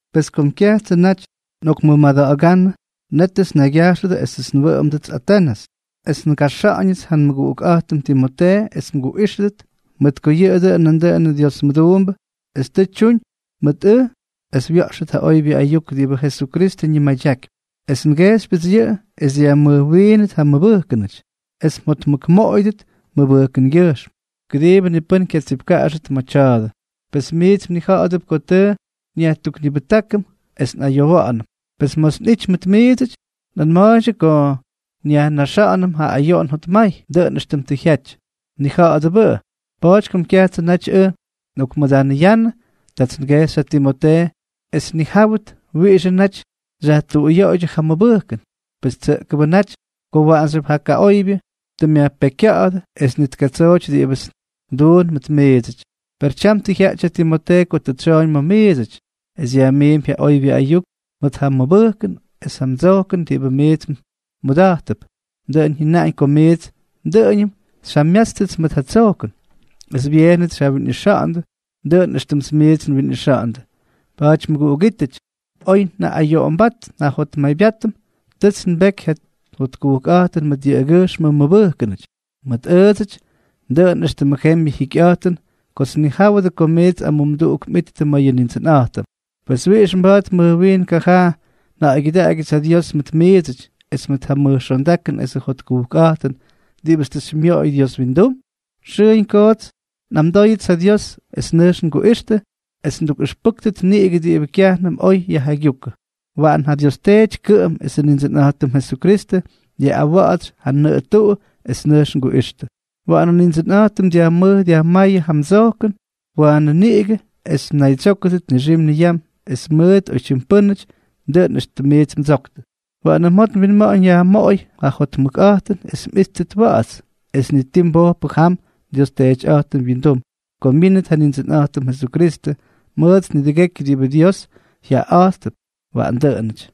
Pes kom kyajtsʉ naty nꞌokmʉmada̱ꞌa̱gánnʉ, nétʉts nnaygya̱jxʉdʉ esʉts nwʉꞌʉmdʉdʉts Atenʉs, es ngaxa̱ꞌa̱ñʉts ja nmʉguꞌukꞌa̱jtʉm Timotee es mguꞌíxʉdʉt, mʉt ko yʉꞌʉ dʉꞌʉn nandʉꞌʉn Dios mʉduumbʉ es tʉ tyuñ mʉt ʉj es wya̱ꞌxʉt ja oybyʉ ayuk diꞌibʉ Jesukristʉ ñimadyakypy. Es ngejxypyʉts yʉꞌʉ es dyajmʉjwiinʉt ja mmʉbʉjkʉnʉty es mjotmʉkmoꞌoyʉdʉt mmʉbʉjkʉngyʉjxm, kʉdiibʉ ni pʉ́n kyatsipkaꞌaxʉt mʉdʉ tya̱a̱dʉ. Pes miits mnija̱ꞌa̱dʉp ko tʉ nyajtuknibʉjtákʉm es nꞌayowa̱ꞌa̱nʉm. Pes ma̱ts nꞌijty mʉt miidsʉty, nꞌanma̱a̱ydyʉ ko nyajnaxa̱ꞌa̱nʉm ja ayoꞌon jotmay, dʉꞌʉn éxtʉm tʉ jyaty. Mnija̱ꞌa̱dʉbʉꞌʉ. Pa̱a̱ty kom kyajtsʉ naty ʉj nꞌokmʉdanʉyannʉ, tats ngejxy ja Timotee es tnijáwʉt wiꞌixʉ naty xyajtuꞌuyoꞌoydyʉ ja mmʉbʉjkʉn, pes tsʉꞌkʉbʉ naty ko waꞌanxyʉp ja kaꞌoybyʉ tʉ myajpekykya̱ꞌa̱dʉ es ni ti tkatsooty diꞌibʉts nduun ma̱ miidsʉty. Per tyam tʉ jyaꞌty ja Timotee ko tʉ tsyooñ ma̱ miidsʉty, es yajmiimpy ja oybyʉ ayuk mʉt ja mmʉbʉjkʉn es ja mdsojkʉn diꞌibʉ miits mmʉda̱jttʉp. Dʉꞌʉn jyʉnaꞌañ ko miits dʉꞌʉñʉm xyjamyátstʉts mʉt ja tsojkʉn, es byeenʉts xyjawinꞌixa̱ꞌa̱ndʉ, dʉꞌʉn éxtʉmts miits nwinꞌixa̱ꞌa̱ndʉ. Pa̱a̱ty mʉguꞌugítʉty, oy njaꞌꞌayoꞌombát njajotmaybyátpʉts, tʉts nbeky ja jotkujkꞌa̱jtʉn mʉt yʉꞌʉgyʉjxmʉ mmʉbʉjkʉnʉty. Mʉt ʉʉdsʉty dʉꞌʉn éxtʉmʉ jembyʉ jikyꞌa̱jtʉn kots nnijáwʉdʉ ko miits amumduꞌuk mꞌittʉ ma̱ yʉ Nindsʉnꞌa̱jtʉm. Pes ¿wiꞌix mba̱a̱t mʉj wiin kajaa nja̱ꞌa̱ygyʉdaꞌagyʉts ja Dios mʉt miidsʉty, es mʉt ja mʉj xondakʉn esʉ jotkujkꞌa̱jtʉn diꞌibʉts tʉ xymyoꞌoy Dios windum? Xʉʉñ koots nꞌamdóyʉts ja Dios es nʉjx nguꞌixtʉ es nꞌaktukꞌʉxpʉ́ktʉt niꞌigʉ diꞌibʉ kyajnʉm oy xyjaygyúkʉdʉ. Waꞌan ja Dios Teety kʉꞌʉm, esʉ Nindsʉnꞌa̱jtʉm Jesukristʉ, dyaꞌꞌawa̱ꞌa̱tsy ja nʉꞌʉ tuꞌu es nʉjx nguꞌixtʉ. Waꞌanʉ Nindsʉnꞌa̱jtʉm dyajmʉj dyajmáyʉ yʉ mdsojkʉn waanʉ niꞌigʉ es mnaydsyókʉdʉt nixim niyam es mʉt oytyim pʉ́nʉty, dʉꞌʉn éxtʉmts miits ndsoktʉ. Waꞌanʉ mjot mwinma̱ꞌa̱ñ yajmoꞌoy ja jotmʉkꞌa̱jtʉn es mꞌíttʉt wa̱ꞌa̱ts, es ni ti mbojpʉ jam nDios Teetyꞌa̱jtʉm wyindum ko myínʉt ja Nindsʉnꞌa̱jtʉm Jesukristʉ mʉt nidʉgekyʉ diꞌibʉ Dios jyaꞌaꞌa̱jttʉp. Waꞌan dʉꞌʉnʉty.